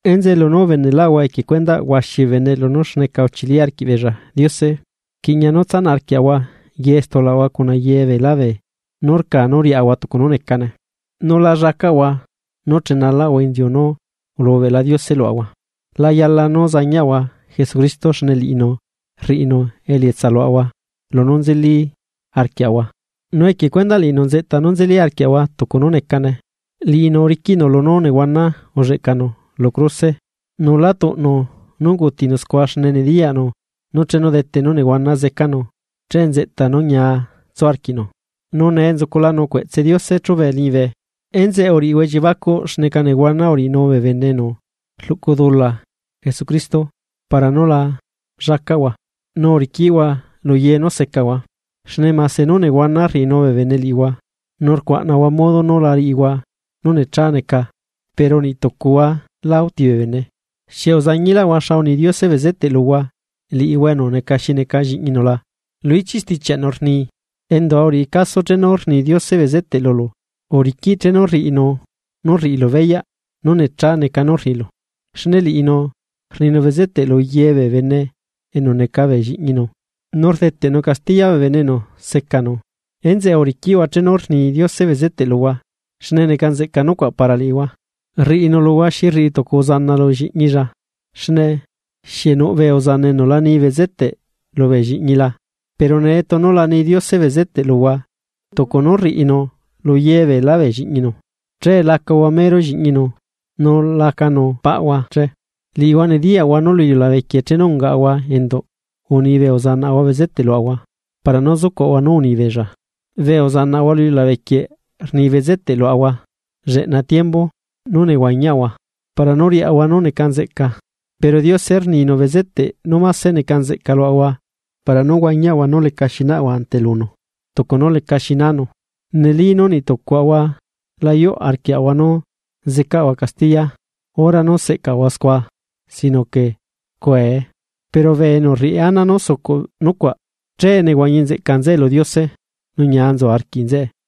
Enzeꞌe lunú ubeneꞌlaꞌahua equie cuendaꞌ huaxi bee bene lunú xneca uchili arquiꞌbeella Diose, rquiꞌña nú tsanaꞌ arquiaꞌahua ye stulaꞌahua cuna ye beelá beenú rca nú riaꞌahua tucu nú necane, nu la llacaꞌahua nú chenalaꞌahua inziu nú ulubeꞌla Diose luaꞌahua. La yala nú zañiaꞌahua Jesucristo xne liꞌinu rriꞌinu elietsa luaꞌahua lunú nzeli arquiaꞌahua, nu equie cuendaꞌ liꞌinu nzeꞌta nú nzeli arquiaꞌahua tucu nú necane. Liꞌinu uriquiꞌnu lunú nehuana ulleꞌcanu lu cruse nu lá tuꞌnu nú ungutinu scua xne nediyaꞌnu nú chenu dete nú nehuana zecanu che nzeꞌta nú ñia tsu arquiꞌnu, nu nee nzuculanu cueꞌtse Diose chube liñibe. Enzeꞌe uriꞌihua elliebacuꞌ xneca nehuana uriꞌinu bee bene enu rluꞌcu dula Jesucristo para nú la llacaꞌhua, nu uriquiꞌhua luye nú secahua. Xne mase nú nehuana rriꞌinu bee bene liꞌihua, nu rcuaꞌnahua modo nú la riꞌihua nú necha neca pero niꞌ tucuhua lá uti bee bene. ¿Xieꞌ uzañiꞌlaꞌhua xa uni Diose bezete luhua liꞌihua enu neca xi neca lliꞌñinu la? Lu ichiꞌ stichiaꞌnu rni: Endua uriꞌi caso chenu rni Diose bezeteꞌ lulu nu uriquiꞌ chenu rriꞌinu nú rriꞌilu beyaꞌ nú necha neca nú rriꞌilu. Xne liꞌinu rninu bezeteꞌ luye bee bene enu neca bee lliꞌñinu, nu rdeteꞌnu castiya bee bene enu secanu. Enzeꞌe uriquiꞌhua chenu rni Diose bezeteꞌ luhua xne neca nzeꞌca nucuaꞌ para liꞌihua. Riꞌinu luhua xi rriꞌi tucu uzana lu lliꞌñilla. ¿Xne xieꞌ nuꞌ bee uzana enu la ni bezeteꞌ lubee lliꞌñila? Pero nee tunu la ni Diose bezeteꞌ luhua tucu nú rriꞌinu luye beela bee lliꞌñinu, che lacahua mero lliꞌñinu nu lacanu paꞌhua che. Liꞌihua nediyaꞌhua nú lu iliulabequieꞌ chenu ungaꞌahua enduꞌ, uni bee uzanaꞌahua bezeteꞌ luaꞌahua para nú zucuaꞌahua nú uni beella. Bee uzanaꞌahua lu iliulabe quieꞌ rni bezeteꞌ luaꞌahua lleꞌna tiembu nú nehuañiaꞌahua para nú riaꞌahua nú neca nzeꞌca. Pero Diose rninu bezeteꞌ nú máse neca nzeꞌca luaꞌahua para nú huañiaꞌahua nú lecaxi naꞌahua ante lunu tucu nú lecaxi nanu. Neli nú niꞌtucuaꞌahua la yuꞌ arquiaꞌahua nú zecaꞌahua castiya hora nú seꞌcaꞌahua scua sino que rcuee, pero bee enu rriꞌi ana nú sucuꞌ nucuaꞌ che nehuañi nzeꞌca nzeꞌe lu Diose nu ñia nzu arquiꞌ nzeꞌe.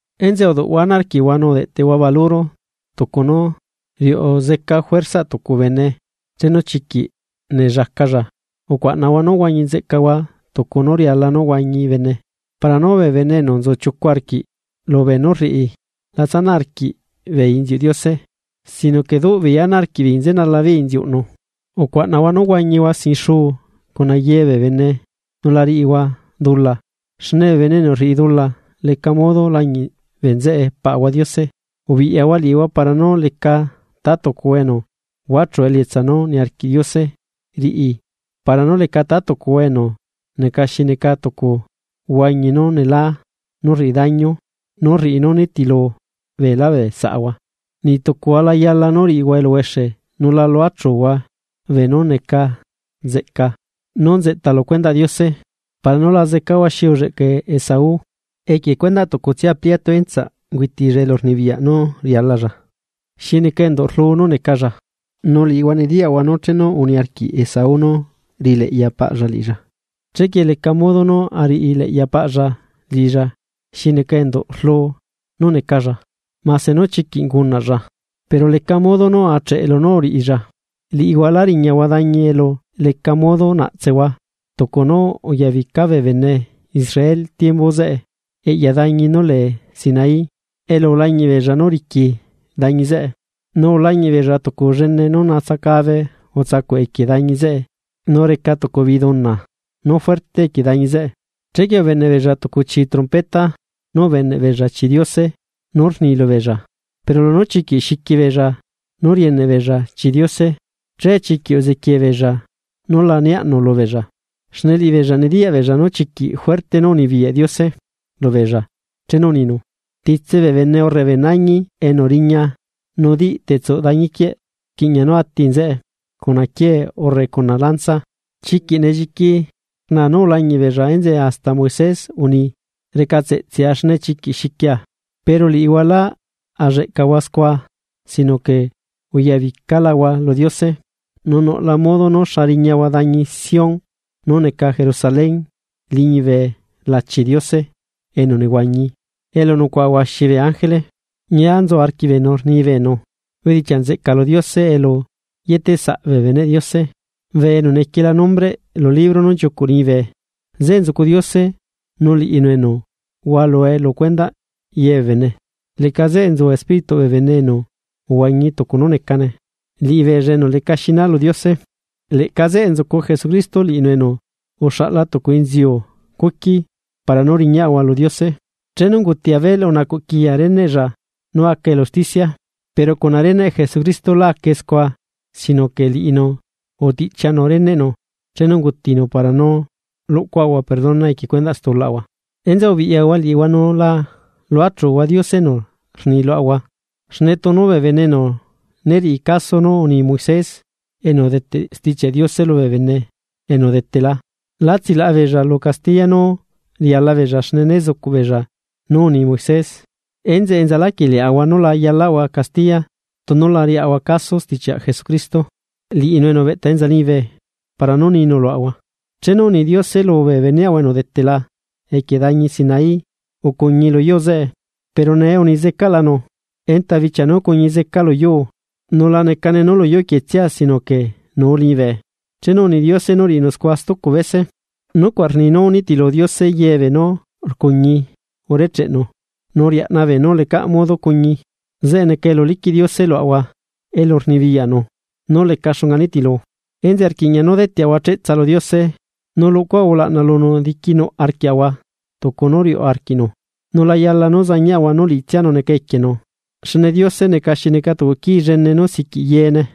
Enzeꞌe uduꞌhua ana arquiꞌhua nu udeꞌteꞌhua baluro tucu nú riuꞌu zeca juerzaꞌ tucu bene chenu chiquiꞌ nellacalla. Ucuaꞌnahua nú huañi nzeꞌcahua tucu nú riala nú huañi bene. Para nú bee bene enu nzu chiucu arquiꞌ lubee nú rriꞌi la tsanaꞌ arquiꞌbeei inziuꞌ Diose sino que duꞌ beei ana arquiꞌbeei chenala beei inziuꞌnu. Ucuaꞌnahua nú huañihua sin xuu cuna ye bee bene nu la riꞌihua dula xne bee bene enu rriꞌi dula leca modo lañiꞌ bee nzeꞌe Paꞌahua Diose. Ubiꞌyahua liꞌihua para nú leca ta tucuhua enu huachu elietsa nú niarquiꞌ Diose riꞌi luhua para nú leca ta tucuhua enu neca xi neca tucu huañi nú nelá nú rriꞌi daño nú rriꞌi nú rnitilu beelá bee saꞌahua. Niꞌtucuhua la yala nú riꞌihua eluhuexe nu la luachuhua beenú neca nzeꞌca nú nzeꞌta lu cuendaꞌ Diose para nú la zecahua xi ulleꞌca Esaú, equie cuendaꞌ tucutsia pliatu entsaꞌ ungüitilla elurnibiyaꞌ nú rialalla xi neca enduꞌ rlu nú necalla. Nu liꞌihua nediyaꞌhua nú chenu uniarquiꞌ Esaú nú riꞌileꞌya paꞌlla liꞌilla, chequie lecaꞌ modo nú ariꞌileꞌya paꞌlla liꞌilla xi neca enduꞌ rlu nú necalla, mase nú chiquiꞌ ungunaꞌlla pero leca modo nú acheꞌe lunú uriꞌilla. Liꞌihua lá riñahua dañi elu leca modo naꞌtsehua, tucu nú uyabica bee bene Israel tiembu zeꞌe eꞌya dañi nú lee Sinaí elu ulañiꞌ beella nú riqui dañi zeꞌe, nu ulañiꞌ beella tucu llene nú natsacabe utsacuꞌ equie dañi zeꞌe nu reca tucu biduna nú fuerte equie dañi zeꞌe. Chequie ubeneꞌ beella tucu chii trompeta, nu ubeneꞌ beella chii Diose nú rnilubeella. Pero lunú chiquiꞌ xiqui beella nú rieneꞌ beella chii Diose, che chiquiꞌ uzequie beella nú la niaꞌnu lubeella. Xne liꞌibeella nediyaꞌ beella nú chiquiꞌ juerte nú unibiyaꞌ Diose lubeella chenu uninu: “Titse bee bene urre bee nañi enu riña nu diꞌ tetsuꞌ dañi quieꞌ rquiꞌña nú ati nzeꞌe cuna quiee urre cuna lanza.” Chiquiꞌ nelliqui rna nú ulañiꞌ beella enzeꞌe hasta Moisés unii: “Recatseꞌtsea xne chiquiꞌ xiquia.” Pero liꞌihua lá alleꞌcahua scua sinoque uyabicalahua lu Diose. Nu nuꞌla modo nú xa rñiahua dañi Sión, nú neca Jerusalén liñibe lachi Diose enu nehuañi, elu nucuaꞌa huaxi bee ángele. Ñia nzu arquiꞌbeenu rni beenu bedichiaꞌ nzeꞌca lu Diose elu yetesaꞌ bee beneꞌ Diose bee enu nequiela nombreꞌ lu libro nú nchiucuꞌ liñibe. Zeꞌe nzucu Diose nu liꞌinu enu hualue lu cuendaꞌ ye bee bene, leꞌca zeꞌe nzu espírituꞌ bee bene enu uhuañi tucu nú necane, liꞌibeella enu leca xina lu Diose. Leꞌca zeꞌe nzucu Jesucristo, liꞌinu enu uxaꞌla tucu inziu cuqui para nú riñaꞌahua lu Diose. Chenu unguti Abel unacuꞌ quiya reneꞌlla nu aca elu usticia, pero cuna reneꞌ Jesucristo la acae scua sino que liꞌinu utiꞌchianu reneꞌnu chenu ungutinu para nú luꞌcuaꞌahua perdona equie stulaꞌahua. Enzeꞌe ubiꞌyahua liꞌihua nu la luachuhua Diose enu rni luaꞌahua. Xne bee bene enu né riꞌi caso nú uni Moises enu udeteꞌ Stichiaꞌ Diose lubee bene enu udetela lá tsilaꞌa beella lu castiya nu riala beella xne né zucuꞌ beella nú uni Moisés. Enzeꞌe enzalaquieꞌ liaꞌahua nu la yalaꞌahua castiya tunu la riaꞌahua caso stichiaꞌ Jesucristo, liꞌinu enu ubeꞌta enza liñibe para nú ninu luaꞌahua. Chenu uni Diose lubee beneꞌahua enu udetela equie dañi Sinaí, ucuñi luyuu zeꞌe. Pero nee unizecaꞌlanu: “Enta bichia nú cuñi zeca luyuu, nu la necane nú luyuu quietsia sino que nuu liñibe.” Chenu uni Diose nú riꞌinu scua stucu bese, nucuaꞌ rni nú nitilu Diose yebee nú rcuñi urecheꞌnu lu iliulabe quieꞌ nu riaꞌna beenú lecaꞌ modo cuñi. Zeꞌe neca elu liquiꞌ Diose luaꞌahua elu rnibiyaꞌnu nú leca xunga nitilu, enzeꞌe rquiꞌña nú deteꞌahua cheꞌtsa lu Diose. Nu luꞌcuaꞌahua ulaꞌna lunu diquinuꞌ arquiaꞌahua tucu nú riuꞌ arquiꞌnu, nu la yala nú zañiaꞌahua nú liꞌitsianu neca equienu. Xne Diose neca xi neca tucu quii llene nú siquiꞌ yeene.